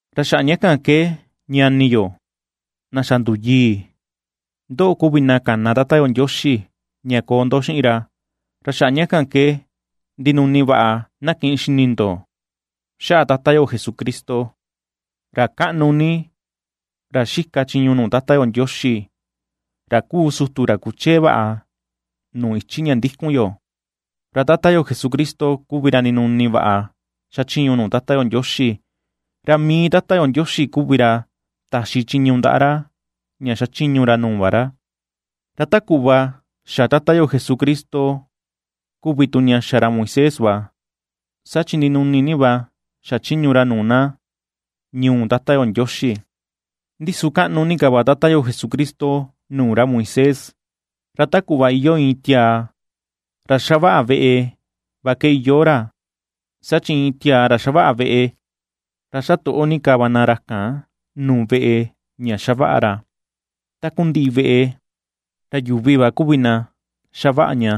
Ra xaꞌa ña kan ke ñani yo, na xa nduyii, ndoꞌo kuvi na kana Tata yo Ndioxi ña koo ndo xiꞌin ra, ra xaꞌa ña kan ke ndinuni vaꞌa na kiꞌin xini ndo xaꞌa Tata yo Jesucristo, ra kaꞌnu ni, ra xika chiñu nuu Tata yo Ndioxi, ra kuu sutu ra kuchee vaꞌa nuu ichi ña ndikun yo. Ra Tata yo Jesucristo kuvi ra ndinuni vaꞌa xachiñu nuu Tata yo Ndioxi, ra mii Tata yo Ndioxi kuvi ra taxi chiñu ndaꞌa ra ña ^xachiñu ra nuu va ra; ra ta kuꞌva xa Tata yo Jesucristo kuvi tu ña xa ra Moisés va, saa chi ndinuni ni va xachiñu ra nuu na ñuu Tata yo Ndioxi. Ndi su kaꞌnu ni ka va Tata yo Jesucristo nuu ra Moisés, ra ta kuꞌva iyoo iin tiaa ra xavaꞌa veꞌe va ke iyoo ra, saa chi iin tiaa ra xavaꞌa veꞌe, ra xa toꞌo ni ka va na ra kan nuu veꞌe ña xavaꞌa ra. Takundiꞌi veꞌe, ra yuvi va kuvi na xavaꞌa ña;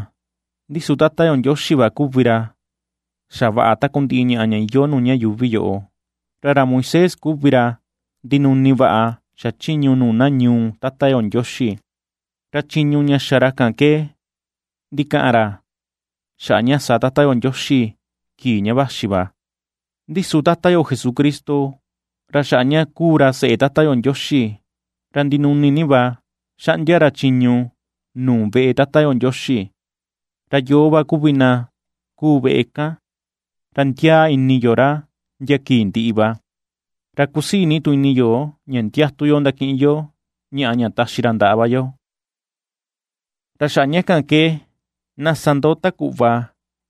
ndi su Tata yo Ndioxi va kuvi ra xavaꞌa takundiꞌi ñaꞌa ña iyoo nuu ña yuuvi yoꞌo. Ra ra Moisés kuvi ra ndinuni vaꞌa xachiñu nuu na ñuu Tata yo Ndioxi; ra chiñu ña xa ra ke ndikaꞌan ra xaꞌa ña sa Tata yo Ndioxi kii ña vaxi va. Ndi su Tata yo Jesucristo, ra xaꞌa ña kuu ra seꞌe Tata yo Ndioxi, ra ndinuni ni va xaꞌndia ra chiñu nuu veꞌe Tata yo Ndioxi. Ra yoo va kuvi na kuu veꞌe kan, ra ndiaa ini yo ra ndia kii ndiꞌi va, ra kusii ni tu ini yo ña ndiatu yo ndakiꞌin yo ñaꞌa ña taxi ra ndaꞌa va yo. Ra xaꞌa ña kan ke na sa ndo ta kuꞌva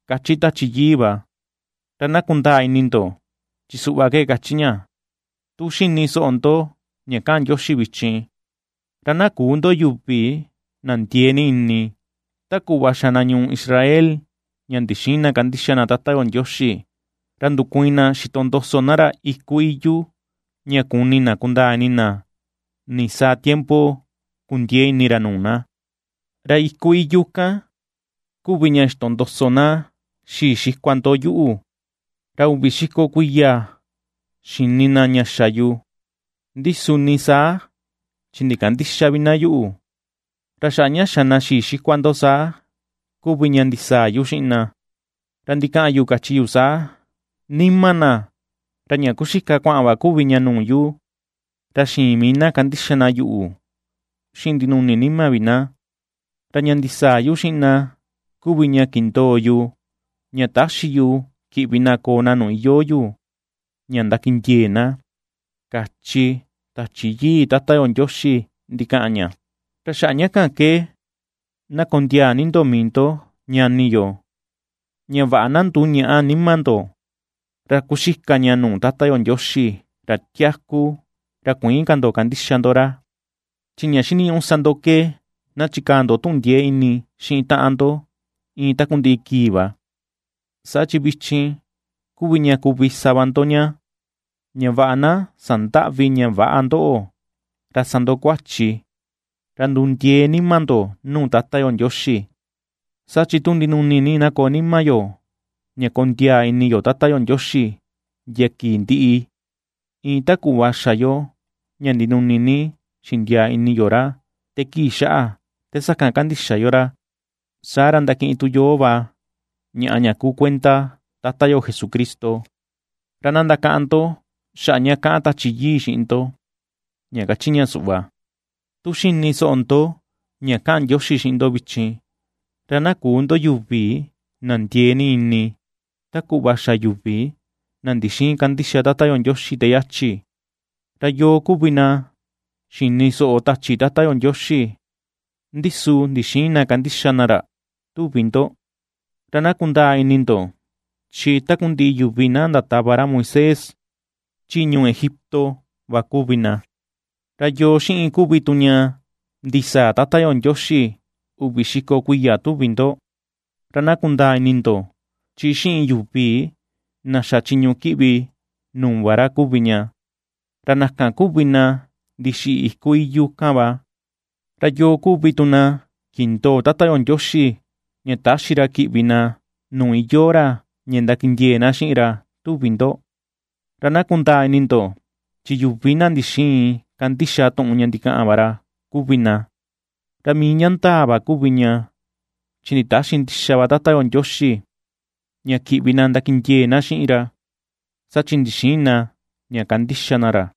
kachi Tachi Yii va, ra na kundaa ini ndo chi suꞌva ke kachi ña: Tu xini soꞌo ndo ña kaꞌan Ndioxi vichin, ra na küu ndo yuvi na ndiee ni ini, ta kuꞌva xa na ñuu Israel ña ndixïin na kandixa na Tata yo Ndioxi ra ndukuiin na xitondoso na ra iku iyu, ña kuni na kundaa ini na nisaa tiempo kundiee ini ra nuu na. Ra iku iyu kan kuvi ña xitondoso na xii xikua ndo yuꞌu, ra uvi xiko vi kuiya xini na ña xa yu, ndi su ni saa chi ndikandïxa vi na yuꞌu. Ra xaꞌa ña xa na xii xikua ndo saa kuvi ña ndisaa yu xiꞌin na, ra ndikaꞌan yu kachi yu saa: “Nima na, ra ña kuxika kuaꞌan va kuvi ña nuu yu, ra xïin mii na kandixa na yuꞌu xiꞌin ndinuni nima vi na.” Ra ña ndisaa yu xiꞌin na kuvi ña kindoo yu, ña täxi yu kiꞌvi na koo na nuu iyoo yu ña ndakindiee na, kachi Tachi Yii Tata yo Ndioxi ndikaꞌan ña. Ra xaꞌa ña kan ke na kondiaa ni ndo mii ndo, ñani yo, ña vaꞌa na nduñäꞌa nima ndo, ra kuxika ña nuu Tata yo Ndioxi, ra tiaku, ra kuïin ka ndo kandixa ndo ra. Chi ña xiniñuꞌu sa ndo ke na chikaa ndo tuꞌun ndiee ini xiꞌin taꞌan ndo iin takundiꞌi kii va, saa chi vichin kuvi ña kuvi sa va ndo ña; ña vaꞌa na sandäꞌvi ña väꞌa ndoꞌo ra sa ndo kuachi, ra ndundiee nima ndo nuu Tata yo Ndioxi. Saa chi tu ndinuni ni na koo nima yo ña kondiaa ini yo Tata yo Ndioxi ndia kii ndiꞌi, iin ta kuꞌva xa yo ña ndinuni ni xindiaa ini yo ra te kii xaꞌa te sakan kandixa yo ra, saa ra ndakiꞌin tu yoo va ñaꞌa ña kuu kuenda Tata yo Jesucristo. Ra na ndakaꞌan ndo xaꞌa ña kaꞌan Tachi Yii xiꞌin ndo, ña kachi ña suꞌva: Tu xini soꞌo ndo ña kaꞌan Ndioxi xiꞌin ndo vichin, ra na küu ndo yuvi na ndiee ni ini ta kuꞌva xa yuvi, na ndixïin kandixa Tata yo Ndioxi te yachi. ¿Ra yoo kuvi na xini soꞌo tachi Tata yo Ndioxi, ndi su ndixïin na kandixa na ra, tuvi ndo? Ra na kundaa ini ndo chi takundiꞌi yuvi na ndatava ra Moisés chi ñuu Egipto va kuvi na. ¿Ra yoo xiꞌin kuvi tu ña ndisaa Tata yo Ndioxi uvi xiko kuiya tuvi ndo? Ra na kundaa ini ndo chi xiꞌin yuvi na xa chiñu kiꞌvi nuu va ra kuvi ña, ra na kan kuvi na ndixiꞌi iku iyu kan va. ¿Ra yoo kuvi tu na kindoo Tata yo Ndioxi ña täxi ra kiꞌvi na nuu iyoo ra ña ndakindiee na xiꞌin ra tuvi ndo? Ra na kundaa ini ndo chi yuvi na ndixïin kandixa tuꞌun ña ndikaꞌan va ra kuvi na. Ra mii ña ndaa va kuvi ña chi nditäxi ndixa va Tata yo Ndioxi ña kiꞌvi na ndakindiee na xiꞌin ra, saa chi ndixïin na ña kandixa na ra.